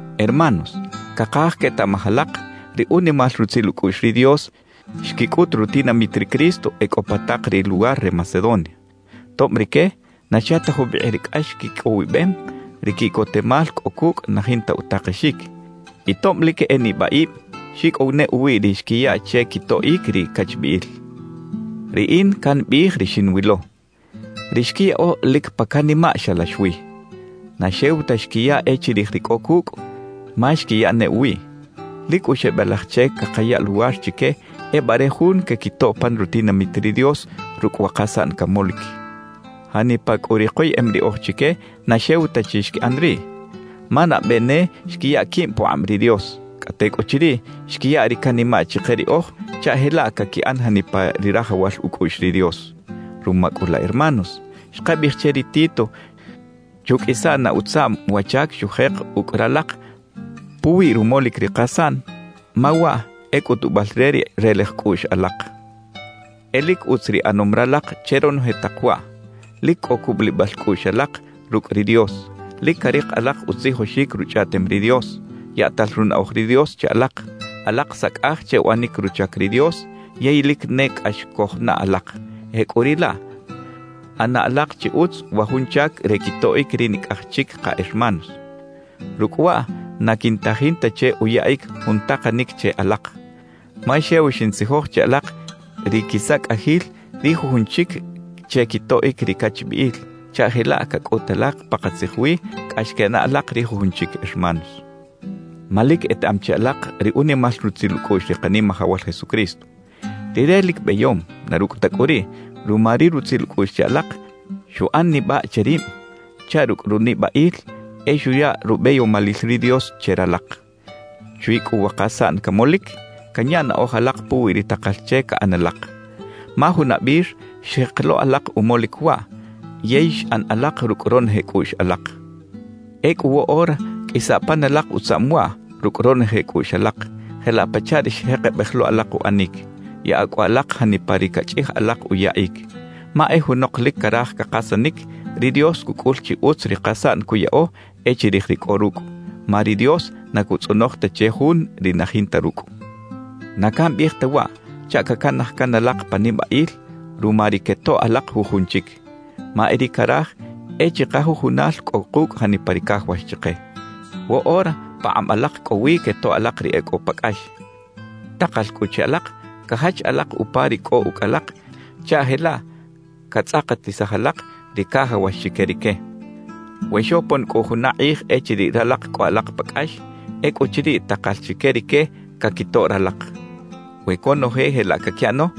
Hermanos, cakaj quetaꞌmaj alak ri unimal rutzil ucꞌuꞌx ri Dios xquicꞌut rutinamit ri Cristo e cꞌo pa tak ri luwar re Macedonia. Tob rique na xa ta jubikꞌ ri cꞌax quicꞌowibem, ri quiꞌcotemal cꞌo cucꞌ na jinta utakexic. Y tob lic e nibaꞌib, xicꞌow ne uwiꞌ ri xquiya che quitoꞌic ri cachbiꞌil. Riꞌin cambiꞌij ri xinwilo: Ri xquiyaꞌo lic pa canimaꞌ xalax wi. Na xew ta xquiya e chirij ri cꞌo cucꞌ, ma xquiya ne uwiꞌ. Lic cꞌu xebelaj che cakaya luwar chique ebare jun quequitoꞌ pan rutinamit ri Dios rucꞌ wa kasaꞌn camolic. Janipa cꞌu ri koyeꞌem riꞌoj chique na xew ta chi xquiꞌan riꞌ, ma nabe ne xquiya quib pukꞌab ri Dios, cꞌa tecꞌuchiriꞌ xquiya ri canimaꞌ chike riꞌoj chaꞌ jelaꞌ caquiꞌan janipa ri rajawal ucꞌuꞌx ri Dios. Ruma cꞌu laꞌ hermanos, xkabiꞌij che ri Tito chuqꞌuisa na utzaꞌm wa chac xujek ucꞌ ralak puwi rumolic ri kasaꞌn, ma waꞌ e cꞌutubal re ri relej cꞌuꞌx alak. E lic utz ri ꞌanom ralak che ronoje tak waꞌ: lic cꞌo cubulibal cꞌuꞌx alak rucꞌ ri Dios, lic carik alak utzijoxic Ruchꞌaꞌtem ri Dios, yaꞌtal runaꞌoj ri Dios che alak, alak sacꞌaj che uꞌanic ruchac ri Dios yey lic ne cꞌax cojnaꞌ alak; jecꞌuriꞌlaꞌ, ꞌana alak chi utz wa jun chac re quitoꞌic ri nicꞌaj chic ka hermanos. Rucꞌ waꞌ na quintajin ta che uyaꞌic jun takanic che alak. Ma xew xintzijoj che alak ri quisacꞌajil ri jujun chic che quitoꞌic ri cachbiꞌil, chaꞌ jelaꞌ cacꞌut alak pakatzij wi cꞌax quenaꞌ alak ri jujun chic hermanos. Ma lic etaꞌam chi alak ri unimal rutzil ucꞌuꞌx ri Kanimajawal Jesucristo. Rire lic beyom; na rucꞌ ta cꞌu riꞌ, ruma ri rutzil ucꞌuꞌx che alak, xuꞌan nibaꞌ che rib chaꞌ rucꞌ runibaꞌil e xuya rubeyomalil ri Dios che ralak. Chwi cꞌu wa kasaꞌn camolic, canya naꞌoj alak puwi ri takal che caꞌan alak; ma junabir xjek lo alak umolic waꞌ yey xꞌan alak rucꞌ ronoje cꞌuꞌx alak. Ecꞌu woꞌora qꞌuisa pan alak utzaꞌm waꞌ rucꞌ ronoje cꞌuꞌx alak, jelaꞌ pachaꞌ ri xjekebej lo alak uꞌanic. Yaꞌa cꞌu alak janipa ri cachꞌij alak uyaꞌic. Ma e junok lic caraj cakasanic, ri Dios cucꞌul chi utz ri kasaꞌn cuyaꞌo e chirij ri cꞌo rucꞌ; ma ri Dios na cutzꞌonoj ta che jun ri na jinta rucꞌ. Na cambiꞌij ta waꞌ chaꞌ cacanaj can alak pa nibaꞌil ruma ri quetoꞌ alak jujun chic. Ma e ri caraj e chikajujunal cꞌo kucꞌ janipa ri cajawax chike. Woꞌora pakꞌab alak cꞌo wi quetoꞌ alak ri e cꞌo pa cꞌax. Takal cꞌu che alak cajach alak upa ri cꞌo ucꞌ alak chaꞌ jelaꞌ catzꞌakatisaj alak ri cajawax chique rique. We xopon cꞌu juna kꞌij echiriꞌ ralak cꞌo alak pa cꞌax, ecꞌuchiriꞌ takal chique rique caquitoꞌ ralak. We conoje jelaꞌ caquiꞌano,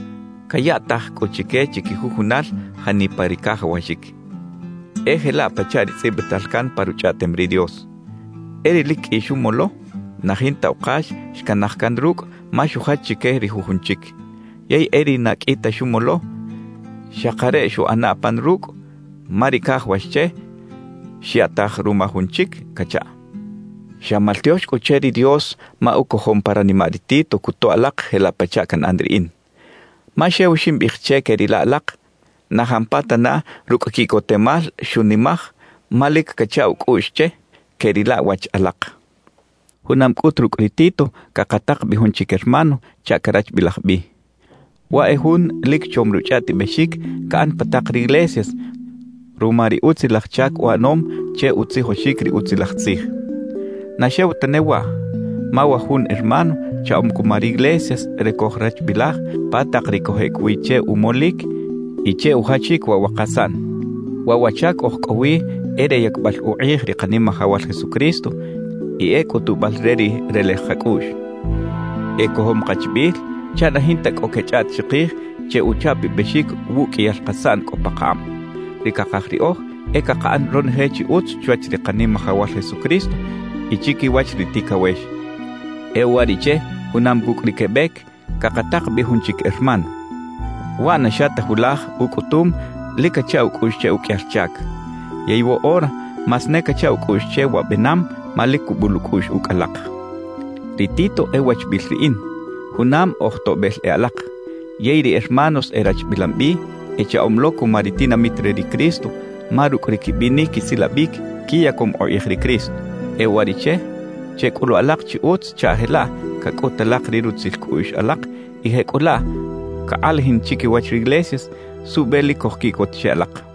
cayaꞌtaj cꞌu chique chiquijujunal janipa ri cajawaxic. E jelaꞌ pachaꞌ ri tzꞌibital can pa Ruchꞌaꞌtem ri Dios: E ri lic qꞌui xumolo, na jinta ukax xcanaj can rucꞌ ma xujach chique ri jujun chic; yey e ri na qꞌui ta xumolo, xakareꞌ xuꞌana pan rucꞌ ma ri cajawax che xyaꞌtaj ruma jun chic cachaꞌ. Xa maltiox cꞌu che ri Dios ma ucojom pa ranimaꞌ ri Tito cutoꞌ alak jelaꞌ pachaꞌ canꞌan riꞌin. Ma xew ximbiꞌij che queꞌrila alak, na jampatana rucꞌ quiꞌcotemal xunimaj ma lic cacha ucꞌuꞌx che queꞌrila wach alak. Junam cꞌut rucꞌ ri Tito cakatak bi jun chic hermano chaꞌ carachbilaj bi. Waꞌ e jun lic chom ruchꞌaꞌtibexic caꞌan pa tak riglesias ruma ri utzilaj chac uꞌanom che utzijoxic ri Utzilaj Tzij. Na xew tane waꞌ, ma wa jun hermano chaꞌom cuma riglesias re cojrachbilaj pa tak ri cojꞌec wi che umolic y che ujachic waꞌ wa kasaꞌn. Waꞌ wa chac oj cꞌo wi e re yacbal ukꞌij ri Kanimajawal Jesucristo y e cꞌutubal re ri relej kacꞌuꞌx. Ecojom kachbiꞌil chaꞌ na jinta cꞌo quechꞌaꞌt chikij che uchapabexic wuꞌqꞌuiyal kasaꞌn cꞌo pakakꞌab. Ri cakaj riꞌoj e cakaꞌan ronoje chi utz chwach ri Kanimajawal Jesucristo y chiquiwach ri ticawex. E uwariꞌche junam cucꞌ ri quebec, cakatak bi jun chic hermano. Waꞌ na xa ta julaj ucꞌutum lic cacha ucꞌuꞌx che uqꞌuiyal chac. Yey woꞌora más ne cacha ucꞌuꞌx che wa benam ma lic cubul ucꞌuꞌx ucꞌ alak. Ri Tito e wachbiꞌil riꞌin, junam oj toꞌbel e alak. Yey ri hermanos erachbilam bi, echaꞌom lo cuma ri tinamit re ri Cristo, ma rucꞌ ri quibinic quisilabic quiyacom ukꞌij ri Cristo. E uwariꞌche checꞌulu alak chi utz chaꞌ jelaꞌ cacꞌut alak ri rutzil cꞌuꞌx alak y jecꞌulaꞌ cakꞌalajin chiquiwach riglesias suꞌbe lic cojquiꞌcot che alak.